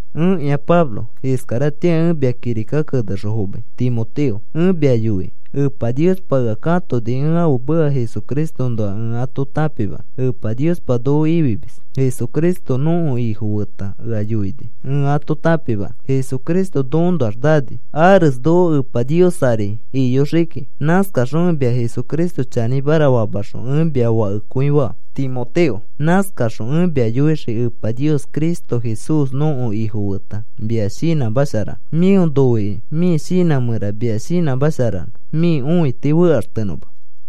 Ẽkĩa Pablo. Iskaratĩa ẽ mia kirika kenexõ fomai Timoteo, ẽ mia yoikĩ. Epa Niospa ea katoni ẽ ãfe meka Jesucristoõnoa ẽ ato tãpimanõ. Epa Nios noko ifimis, Jesucristo nõko Ifo feta ea yoini ẽ ato tãpimanõ. Jesucristo nokoõnoax nani ares noko Epa Nios ari iyoxii kiki. Nãskaxõ ẽ mia Jesucristo chanĩmara famaxõ, ẽ mia fakekõi faa, Timoteo. Nãskaxõ ẽ mia yoixõ Epa Nios, Cristo Jesús nõko Ifo feta mia shinãsharanõ mĩo noikĩ, mĩ shinã mẽra mia shinãmasharanõ, mĩ õiti fekaxtenõma.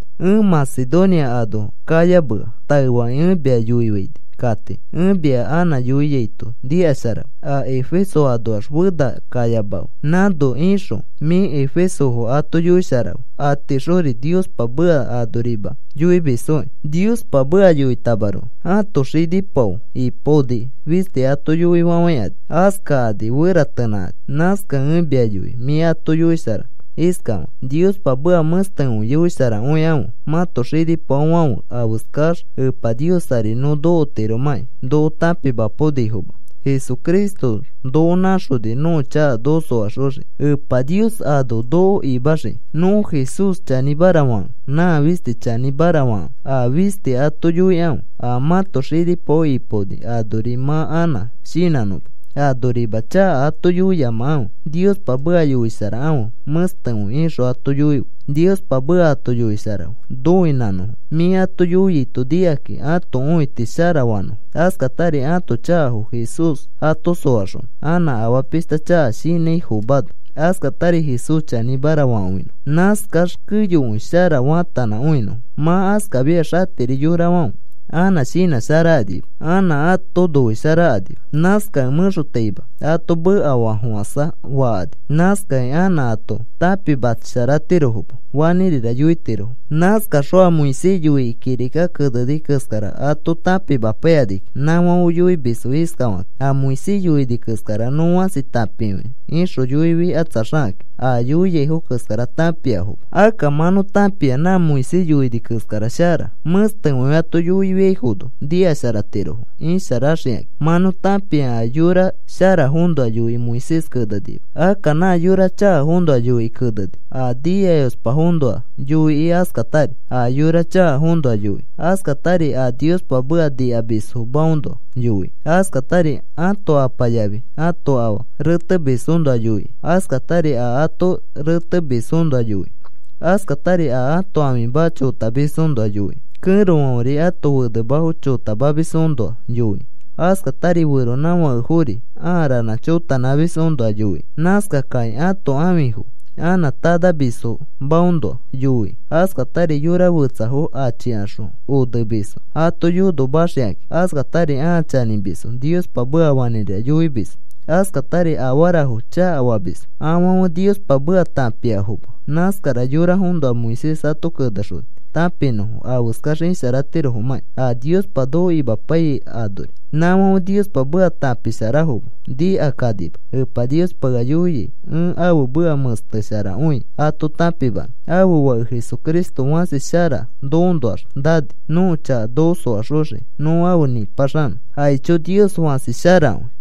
Ẽ Macedonia ano kayamea taefakĩ, ẽ mia yoifaini kati. Ẽ mia anã yoiaito nikasharafe. A Efeso anoax fena kayamafe. Nãno ixõ mĩ efesofo ato yoisharafe. Atiixori Niospa meka anorima yoimisfokĩ. Niospa meka yoitamaroko ãto xinipao ipaoni fisti ato yoifafãikani. Askakani feratenãkani. Nãskakẽ ẽ mia yoi mĩ ato yoisharanõ iskafakĩ: “Niospa meka mẽstekõi yoisharakõikãfe. Mãto xinipaofãfe afeskax Epa Nios ari nõ nokotiromãki noko tãpimapaonifoma. Jesucristo noko nãxoni nõko chaka noko soaxoxiki. Epa Nios ano noko imaxiki nõ Jesús chanĩmara fakẽ. Nã fisti chanĩmara fakãfe, a fisti ato yoikãfe. A mãto xinipao ipaoni anori mã anã shinãnõma. Anorima chaka ato yoiyamakãfe. Niospa meka yoisharakãfe mẽstekõi,” ixõ ato yoife. Niospa meka ato yoisharafe noinãnõfo. Mĩ ato yoiaito nikakĩ ãto õiti sharafanõfo. Askatari ãto chakafo Jesús ato soaxonõ, anã afaa pishta chaka shinãifomano, askatari Jesús chanĩmara fakõinõfo. Nãskax keyokõi shara faatanãkõinõfo. Mã askafiax atiri yorafãfe anã shinãsharakanima. Anã ato noisharakanima. Nãskakĩ mẽxotaima ato mekafafofãsa fakani. Nãskakĩ anã ato tãpimasharatiroma, fanĩrira yoitiro. Nãskaxõ a Moisés yoikĩ kirika keneni keskara ato tãpimapaikakĩ nãfãfe yoimisfo iskafakĩ: “A Moisés yoini keskara nõ fãsi tãpikõia,” ixõ yoifikatsaxakakĩ a yoiaifo keskara tãpikõiafoma. Akka mã nõ tãpia nã Moisés yoini keskara shara. Mẽstekõi ato yoiaifono nikasharatirofo isharaxikakĩ. Mã nõ tãpia a yora sharafoõnoa yoikĩ Moisés kenenima. Akka nã yora chakafoõnoa yoikĩ keneni. A nikayospafoõnoa yoikĩ, askatari a yora chakafoõnoa yoikĩ, askatari a Niospa meka nikamisfomaõnoa yoikĩ, askatari ãto apa yafi ãto afa retemisfoõnoa yoikĩ, askatari a ato retemisfoõnoa yoikĩ, askatari a ãto ãfimafo chotamisfoõnoa yoikĩ, kẽrofãferi ato fenemafo chotamamisfoõnoa yoikĩ, askatari feronãfakefori aa ranã chotanãmisfoõnoa yoikĩ, nãskakãkĩ ãto ãfifo anã tanamisfomaõnoa yoikĩ, askatari yora fetsafo achikaxõ onemisfo ato yonomaxikakĩ, askatari ãa chanĩmisfo, Niospa meka fanĩrira yoimisfo, askatari afarafo chakafamisfo, afãfe Niospa meka tãpiafoma, nãskara yorafoõnoa Moisés ato kenexoni tãpinõfo afeskax isharatirofomãkĩ a Niospa noko imapaiyai anori. Nãfãfe Niospa meka tãpisharafoma, nikakanima. Epa Niospa ea yoia ẽ ãfe meka mẽstesharakõi ato tãpimanõ. Ãfe Fake Jesucristo fãsi shara nokoõnoax nani nõko chaka noko soaxoxiki nõ afe nipaxanõ. Aicho, Nios fãsi sharakõi.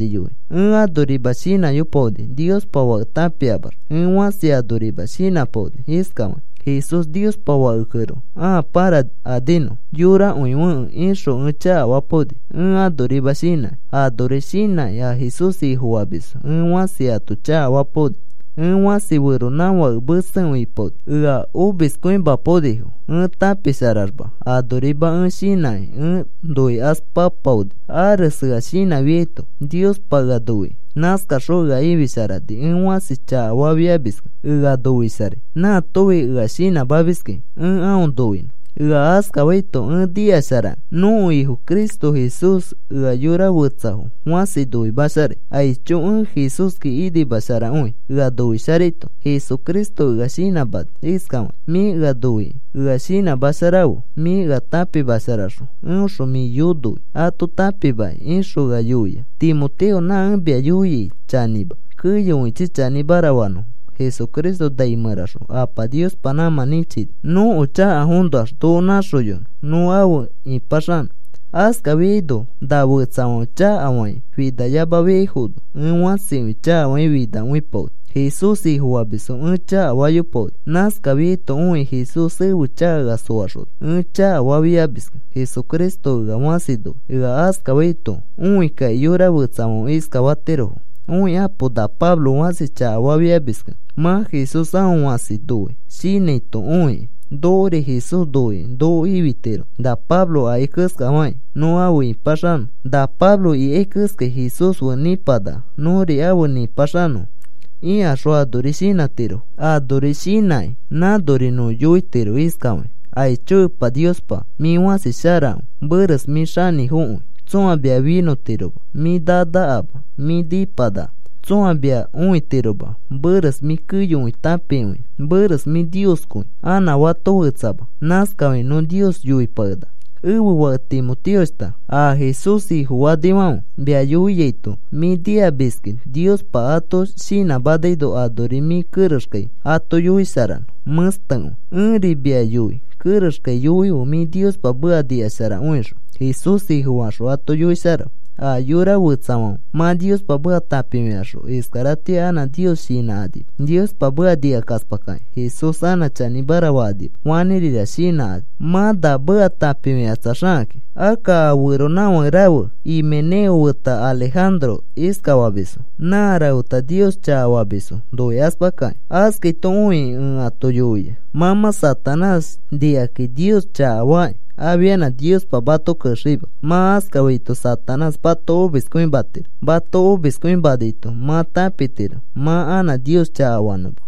Ẽ anorima shinãyopaoni Niospa Fake tãpiaxma. Ẽ fãsi anorima shinãpaoni iskafakĩ: “Jesús Niospa Fakekẽroko. Ãa pãrakaninõ, yorakõifekẽ,” ixõ ẽ chakafapaoni, ẽ anorima shinãkĩ. Anori shinãki a Jesús Ifofamisfo ẽ fãsi ato chakafapaoni. Ẽ fãsi feronãfake mesekõi ipaoni ea omispaonifo ẽ tãpisharaxma. Anorima ẽ shinãkĩ ẽ noikaspapaoni, ares ea shinãfiaito Niospa ea noikĩ. Nãskaxõ ea ifisharani. Ẽ fãsi chakafafiamiskẽ ea noisharai. Nãatofi ea shinãmamiskĩ ẽ aõ noinõ. Ea askafaito ẽ nikasharakẽ nõko Ifo Cristo Jesús ea yora fetsafo fãsi noimasharai. Aicho, ẽ Jesúski inimasharakõi ea noisharaito. Jesucristo ea shinãmani iskafakĩ: “Mĩ ea noikĩ, ea shinãsharafe, mĩ ea tãpisharaxõ eõxõ mĩ yonoi ato tãpimakĩ,” ixõ ea yoia. Timoteo, na ẽ mia yoiai chanĩma. Keyokõichi chanĩmara fanõfo. Jesucristo nai mẽraxõ Apa Niospa nãmã nĩchini nõko chakafoõnoax noko nãxoyonõ nõ afe ĩpaxanõfo. Askafiaino na fetsafãfe chakafakĩ finayamafiaifono ẽ fãsikõi chakafakĩ finakõipaoni. Jesús Ifofamisfo ẽ chakafayopaoni. Nãskafiaito õikĩ Jesús ẽfe chaka ea soaxona. Ẽ chakafafiafimiskẽ Jesucristo ea fãsi noi. Ea askafaito õi kakĩ yora fetsafãfe iskatirofo: “¡Õikapo! Na Pablo fãsi chakafafiamiskẽ mã Jesús aõ fãsi noi,” shinãito õikĩ, “Nokori Jesús noikĩ noko ifitiro, na Pablo akai keskafakĩ, nõ afe ĩpaxanõ na Pablo ikai keskai Jesús fe nipanaka, nõri afe nipaxanõ,” ikaxõ anori shinãtirofo. Anori shinãkĩ nãnori nõ yoitiro iskafakĩ: “Aicho Epa Niospa, mĩ fãsi sharakõi. Meres mĩ xanĩfokõi, tsõa mia finõtiroma. Mĩ nanakama, mĩ nĩpanaka. Tsõa mia õitiroma. Meres mĩ keyokõi tãpikõia. Meres mĩ Nioskõi, anã fato fetsama.” Nãskafakĩ nõ Nios yoipakenaka. Ẽfe fake Timoteoshta, a Jesús Ifofanifãfe mia yoiaito mĩ nikamiski. Niospa ato shinãmanaino anori mĩ kerexkai ato yoisharanõ mẽstekõi, ẽri mia yoi kerexkai yoife mĩ Niospa meka nikasharakõixõ Jesús Ifofaxõ ato yoisharafe. A yora fetsafãfe mã Niospa meka tãpifikaxõ iskaratĩa anã Nios shinãkanima. Niospa meka nikakaspakakĩ Jesús anã chanĩmara fakanima. Fanĩrira shinãkani mã na meka tãpifikatsaxakakĩ. Akka a feronãfake rafe Himeneo feta Alejandro iskafamisfo. Nã rafeta Nios chakafamisfo noikaspakakĩ. Askaito õikĩ ẽ ato yoia: “Mã mã Satanás nikakĩ, Nios chakafakĩ, afianã Niospa mato kexeima.” Mã askafaito Satanás mato omiskõimatiro. Mato omiskõimanaito mã tãpitiro mã anã Nios chakafanõma.